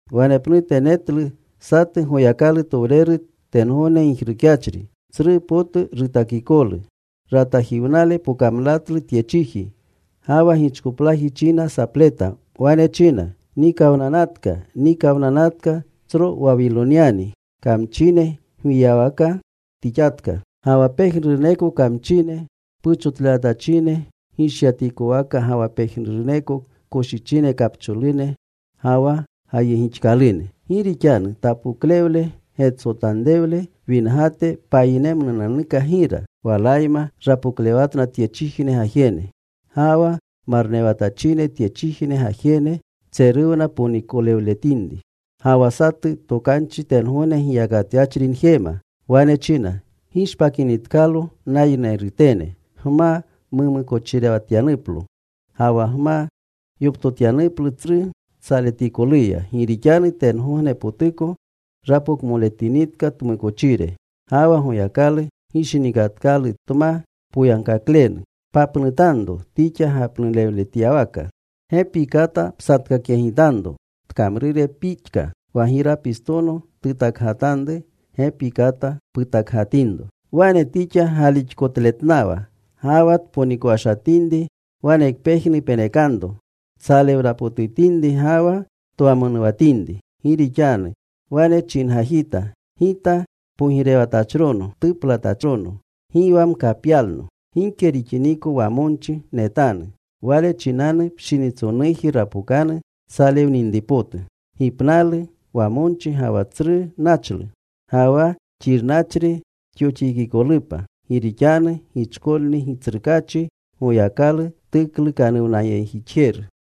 Wanepnute netlu satu Goyakalutowreru tengogne gijrukyachri. Tsru potu rutakikolu. Ratajiwnale pokamlatlu tye chiji. Ga wa gichkoplaji china sapleta. Wane china: ¡Nikawnanatka, nikawnanatka tsro Wawilonyani! Kamchine gwiyawaka tixatka ga wa pejnuruneko kamchine puchotlewatachine gishyatikowaka, ga wa pejnuruneko koshichine kapcholune ga wa gayegixkalune. Gi rixanu tapoklewle getsotanrewle wingate payinemnunanuka gira. Walayma rapoklewatna tyechijne pogirene. Ga wa marnewatachine tyechijne gajene ponikowata tshichponponikowleshatinriya. Ga wa satu tokanchi tengogne giyakatyachri njema. Wane china: Gishpakinitkalo, nayinerutene, gma mumukochirewatyanuplo, ga wa gma yoptotyanuplu tsru tsaletikoluya. Gi rixanu tengognepotuko rapokmoletinitka tmukochire. Ga wa Goyakalu gishinikatkalu tma poyagkaklenu. Papnutanro tixa gapnulewletyawaka. Gepi kata psatkakyegitanro tkamrure pixka. Wa girapistono tutakgatanru, gepi kata putakgatinro. Wane tixa galixkotletnawa ga wa tponikowashatinri wanekpejnu penekanro tsalewnapotutinri ga wa twamonuwatinri. Gi rixanu wane chingajita, “Gita pogirewatachrono tuplatachrono. Gi wa mkapyalno. Gike nixiniko wamonchi netanu.” Wale chinanu pshinitsonuji rapokanu tsalewninripotu: gipnalu, wamonchi, ga wa tsru nachlu. Ga wa xirnachri tyoxikikolupa. Gi rixanu gichkolni Gitsrukaachi Goyakalu tuklukanuwnayegjixjeru.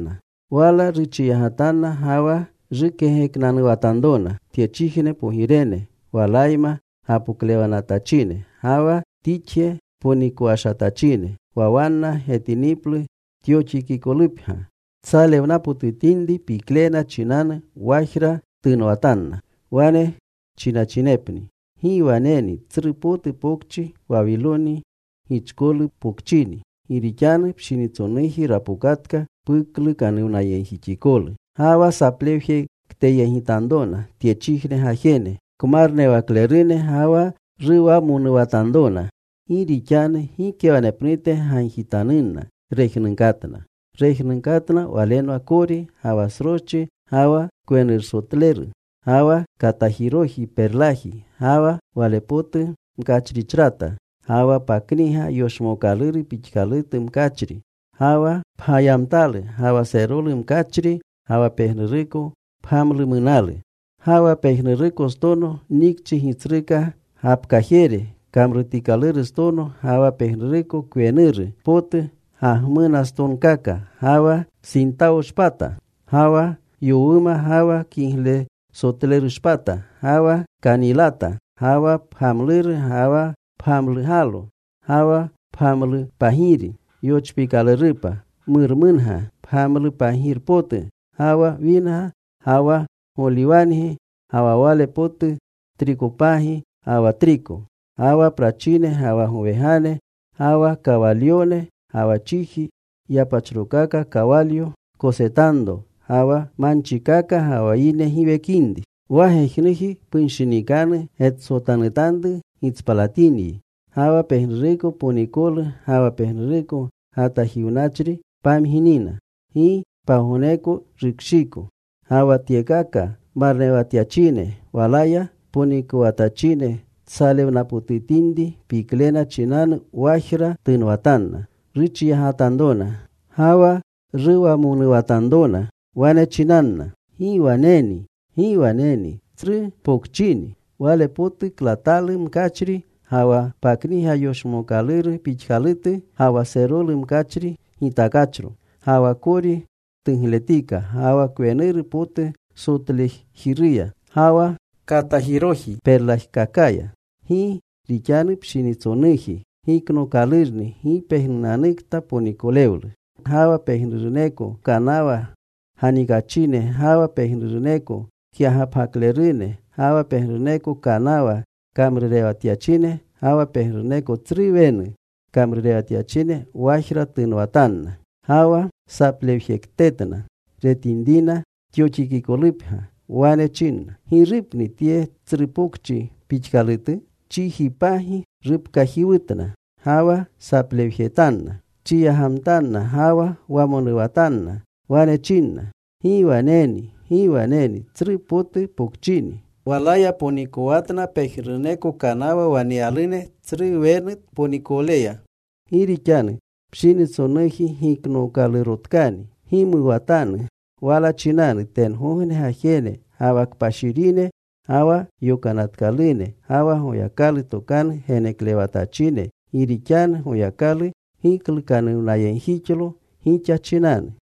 Wala ruchiyagatanna ga wa rukegeknanuwatanrona tyechijne pogirene, walayma gapoklewatachine ga wa tixje ponikowashatachine, wa wanna getiniplu tyoxikikolupgya. Tsalewnapotutinri, piklena chinanu wajra tunwatanna. Wane chinachinepni: ¡Gi waneni! Tsru potu pokchi Wawiloni, gichkolu pokchini. Gi rixanu pshinitsonuji rapokatka puklukanuwnayegjixikolu. Ga wa saplewjekteyegitanrona tyechijne gajene kmarnewaklerune ga wa ruwamonuwatanrona. Gi rixanu gike wanepnute gagjitanunna rejnunkatna. Rejnunkatna walenwa kori, ga wa sroschi, ga wa kwenursotleru, ga wa katajiroji perlaji, ga wa wale potu mkachrichrata, ga wa pakniga yoshmookaluru pixkalutu mkachri, ga wa pgayamtalu, ga wa serolu mkachri, ga wa pejnuruko pgamlumunalu, ga wa pejnurukostono nikchi gitsruka gapkajere kamrutikalurustono, ga wa pejnuruko kwenuru potu gagmunastonkaka, ga wa sintawoshpata, ga wa yowuma, ga wa kiglesotlerushpata. Ga wa kanilata, ga wa pgamluru, ga wa pgamlugalo, ga wa pgamlupagiri yochpiikalurupa, murmunga, pgamlupagirpotu, ga wa winga, ga wa goliwangi, ga wa wale potu trikopagi, ga wa triko, ga wa prachine, ga wa gowegane, ga wa kawalyone, ga wa chiji yapachrokaka kawalyo kosetanro, ga wa manchikaka, ga wa yine giwekinri. Wa gejnuji punshinikanu getsotanutanru gitspalatinyi. Ga wa pejnuruko ponikolu ga wa pejnuruko gatajiwnachri pamginina. Gi pagogneko rukshiiko. Ga wa tyekaka marnewatyachine, walaya ponikowatachine tsalewnapotutinri piklena chinanu wajra tunwatanna. Ruchiyagatanrona ga wa ruwamonuwatanrona. Wane chinanna: ¡Gi waneni! ¡Gi waneni, tsru pokchini! Wale potu klatalu mkachri, ga wa pakniga yoshmookaluru pixkalutu, ga wa serolu mkachri gitakachro. Ga wa kori tugletika, ga wa kwenuru potu sotlejiruya ga wa katajiroji perlajkakaya. Gi rixanu pshinitsonuji giknookalurni gi pejnunanukta ponikolewlu. Ga wa pejnuruneko kanawa ganikachine, ga wa pejnuruneko kyagapgaklerune ga wa pejnuruneko kanawa kamrurewatyachine, ga wa pejnuruneko tsru wenu kamrurewatyachine, wajra tunwatanna. Ga wa saplewjektetna retinrina tyoxikikolupgya. Wane chinna, “¿Girupni tye tsru pokchi pixkalutu?” Chijipagi rupkajiwutna. Ga wa saplewjetanna. Chiyagatanna ga wawamonuwatanna. Wane chinna: ¡Gi waneni! ¡Gi waneni! Tsru potu pokchini. Walaya ponikowatna pejnuruneko kanawa waneyalune tsru wenu, tponikowleya. Gi rixanu pshinitsonuji giknookalurotkani. Gimuwatanu wala chinanu, tengogne gajene ga wa kpashirine, ga wa yokanatkalune, ga wa Goyakalu tokanu geneklewatachine, gi rixanu Goyakalu giklukanuwnayegjixlo gixa chinanu.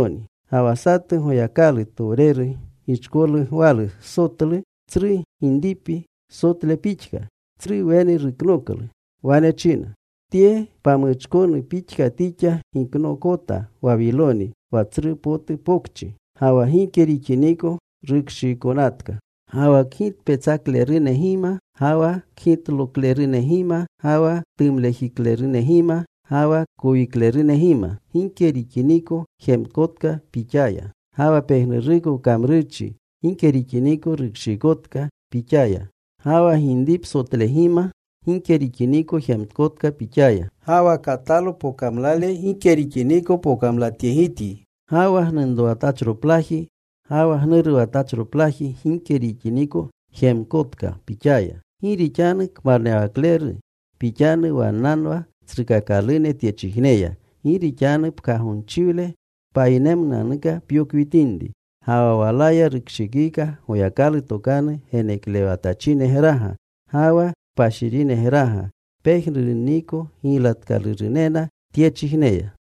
Ga wa satu Goyakalutowreru gichkolu gwalu sotlu, tsru ginripi sotle pixka. Tsru wenu ruknoklu. Wane china: Tye pamuchkonu pixka tixa giknookota Wawiloni, wa tsru potu pokchi. Ga wa gike rixiniko rukshiikonatka. Ga wa kgitpetsaklerunegima ga wa kgitloklerunegima ga wa ktumlejiklerunegima, ga wa kowiklerunegima gike rixiniko jemkotka pixaya. Ga wa pejnuruko kamrurchi gike rixiniko rukshiikotka pixaya. Ga wa ginripsotlegima gike rixiniko jemkotka pixaya. Ga wa katalo pokamlale gike rixiniko pokamlatyegityi. Ga wa gnunrowatachriplaji ga wa gnuruwatachroplaji gike rixiniko jemkotka pixaya. Gi rixanu kmarnewakleru pixanu wannanwa tsrukakalune tyechijneya. Gi rixanu pkagonchiwle payinemnunanuka pyokwitinri. Ga wa walaya rukshikika Goyakalu tokanu geneklewatachinegraga, ga wa kpashirinegraga, pejnurunniko giylatkalurunena tyechijneya.